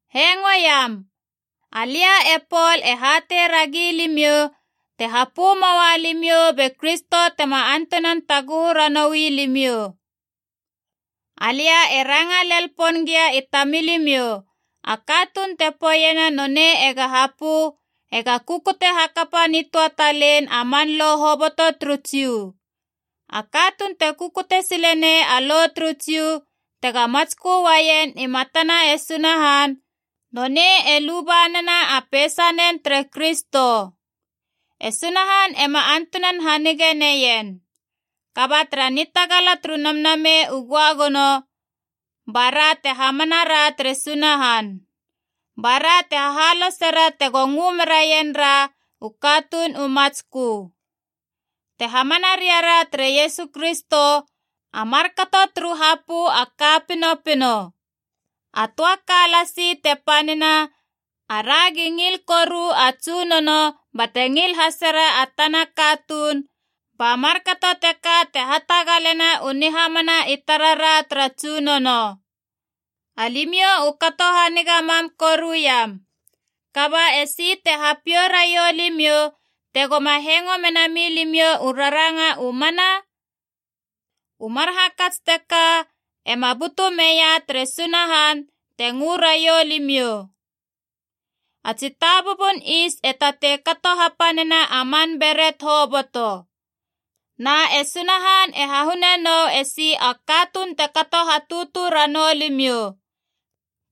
Hengo iam. Alia e Pol e hatei ragi limiou, te hapö moua limiou be Kristo tema antunan taguhu ranoui limiou. Alia e ranga lel pon gia i tamilimiou, a katuun te poeiena nonei ega hapö ega kukute hakapa nitöa talein a man Lo hoboto turu Jiu. A katuun te kukute sile nei a Lo turu Jiu tega matskö uaien i matana e Sunahan, nonei e luba nena a peisanen tere Kristo. E Sunahan ema antunan hanige neien. Kaba tara nitagala turu Namnamei u Göagono bara te hamana ra tere Sunahan. Bara te hahalosera tego ngö meraien ra u katuun u matskö. Te hamana ria ra tere Iesu Kristo, a markato turu hapö a ka pinopino. A töa ka lasi te panina: aragi ngil koru a Tsunono bate ngil hasera a tana katuun, ba markato teka te hatagalena u nihamana i tarara tara Tsunono. Alimiou u kato haniga mam koru iam. Kaba esi te hapiou raiou limiou tegoma hengo mena milimiou u raranga u mana? U mar hakats teka ema butu meia tere Sunahan te ngö raiou limiou. A tsitabubun is e tatei kato hapanena a man beret hoboto. Na e Sunahan e hahune nou esi a katuun te kato hatutu ranou limiou.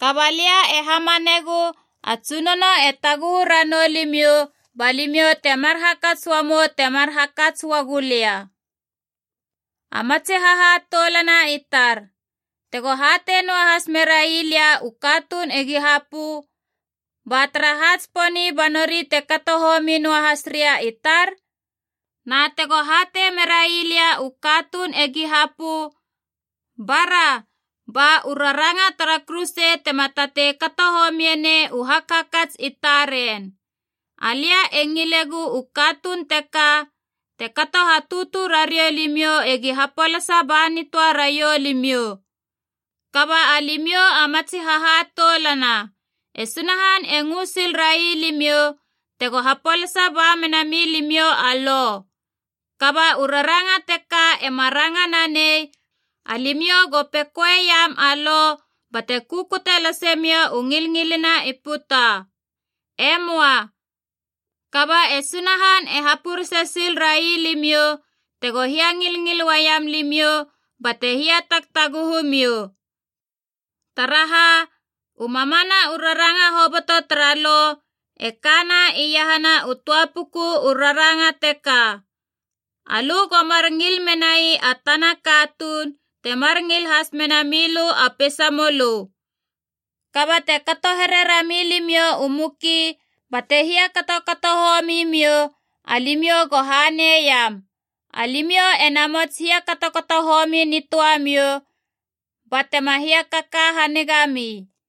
Kaba lia e hamanegu a Tsunono e taguhu ranou limiou ba limiou temar hakats uamou temar hakats uagu lia. A matsi hahatoulana i tar, tego hatei noahas merai lia u katuun egi hapö, ba taraha tsiponi ba nori te kato homi noahas ria i tar? Na tego hatei merai lia u katuun egi hapö, bara ba u raranga tara kuruse tema tatei kato homie nei u hakhakats i taren. Alia e ngilegu u katuun teka te kato hatutu rariou limiou egi hapolasa ba nitöa raiou limiou! Kaba alimiou a matsi hahatoulana, e Sunahan e ngö sil rai limiou tego hapolasa ba mena milimiou a Lo. Kaba u raranga teka ema ranga nanei alimiou go pekoeiam a Lo bate kukute lase miou u ngilngilina i puta. E möa. Kaba e Sunahan e hapurese sil rai limiou tego hiangilngil uaiam limiou bate hiatagtaguhu miou. Taraha, u mamana u raranga hoboto tara Lo e kana iahana u töa puku u raranga teka: alö go mar ngil menai a tana katuun temar ngil has mena milö a peisa mölö. Kaba te kato here rami limiou u muki bate hiakatokato homi miou, alimiou go hanei iam! Alimiou ena mots hiakatokato homi nitöamiou, ba tema hiakaka haniga mi.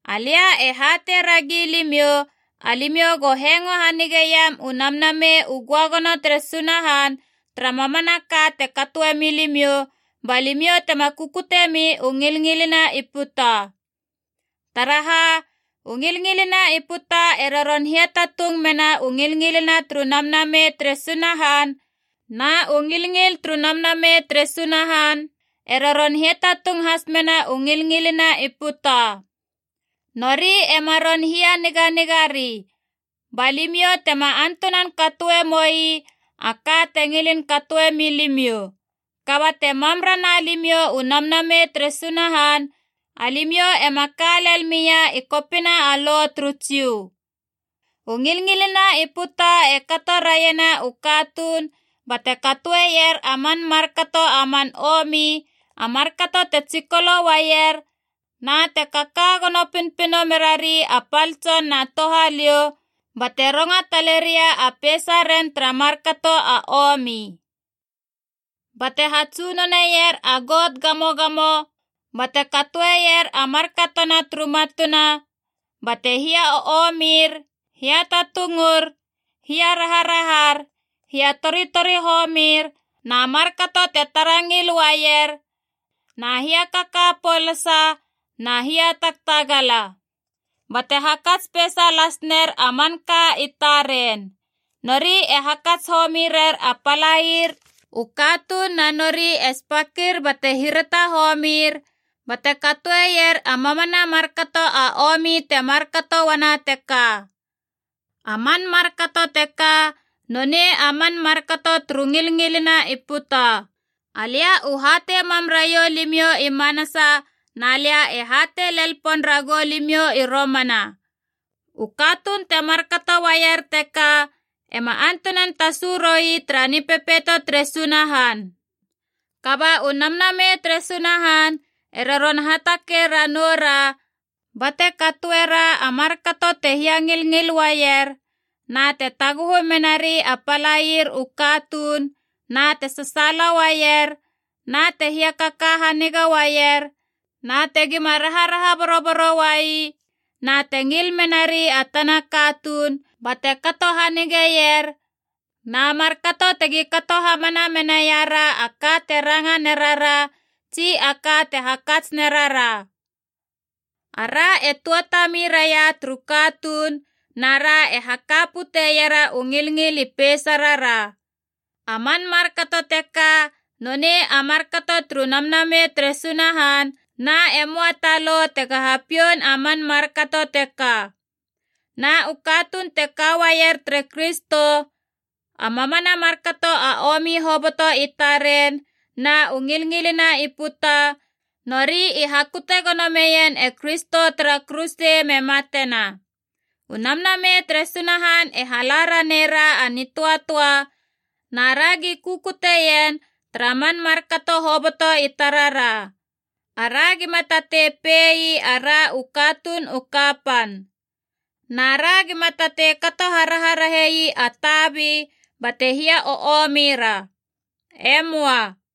Alia e hatei ragi limiou, alimiou go hengo hanigeiam u Namnamei u Göagono tere Sunahan tara mamanaka te katoe milimiou, ba limiou tema kukutiemi u ngilngilina i puta. Taraha, u ngilngilina i puta e roron hiatatung mena u ngilngil turu Namnamei tere Sunahan, na u ngilngil turu Namnamei tere Sunahan e roron hiatatung has mena u ngilngilina i puta. Nori ema ron hianiganiga ri, ba limiou tema antunan katoe moi a ka te ngilin katoe milimiou. Kaba te mam rana limiou u Namnamei tere Sunahan, alimiou ema ka lel mia i kopina a Lo turu Jiu. U ngilngilina i puta e kato raiena u katuun bate katoeier a man markato a man omi: a markato te tsikolo uaier, na te kaka gono pinopino merari a pal tson na touhaliou, bate ronga taleria a peisaren tara markato a omi. Bate hatsunoner a got gamogamo bate katoeier a markatona turu matuna, bate hia o omir, hiatatungur, hiaraharahar, hiatoritori homir, na markato te tara ngil uaier, na hiakaka polasa na hiatagtagala. Bate hakats peisa las ner a manka i taren. Nori e hakats homi rer a palaier u katuun na nori e spakir bate hirata homir, bate katoeier a mamana markato a omi te markato uana teka. A man markato teka nonei a man markato turu ngilngilina i puta. Alia u hatei mam raiou limiou i manasa na lia e hatei lel pon ragou limiou i romana: u katuun te markato uaier teka ema antunan tasu roi tara Nipepeito tere Sunahan. Kaba u Namnamei tere Sunahan e roron hatakei ranoura, bate katoera a markato te hiangilngil uaier na te taguhu merari a palaier u katuun na te sasaala uaier, na te hiakaka haniga uaier, na tegima raharaha boroboro uai, na te ngil menari a tana katuun bate kato hanigeier, na markato tegi kato hamana menaira a ka te ranga nerara tsi a ka te hakats nerara. Ara e tuatami raia turu katuun, nara e haka puteiera u ngilngil i peisarara. A man markato teka nonei a markato turu Namnamei tere Sunahan, na e möa ta lo tega hapioun a man markato teka. Na u katuun te ka uaier tere Kristo, a mamana markato a omi hoboto i taren na u ngilngilina i puta, nori i hakute gono meien e Kristo tara kuruse me matena. U Namnamei tere Sunahan e hala ranei ra a nitöatöa, na ragi kukutie ien tara man markato hoboto i tarara. Ara gima tatei pei ara u katuun u kapan. Na ra gima tatei kato haraharahei a tabi bate hia o omira. E möa.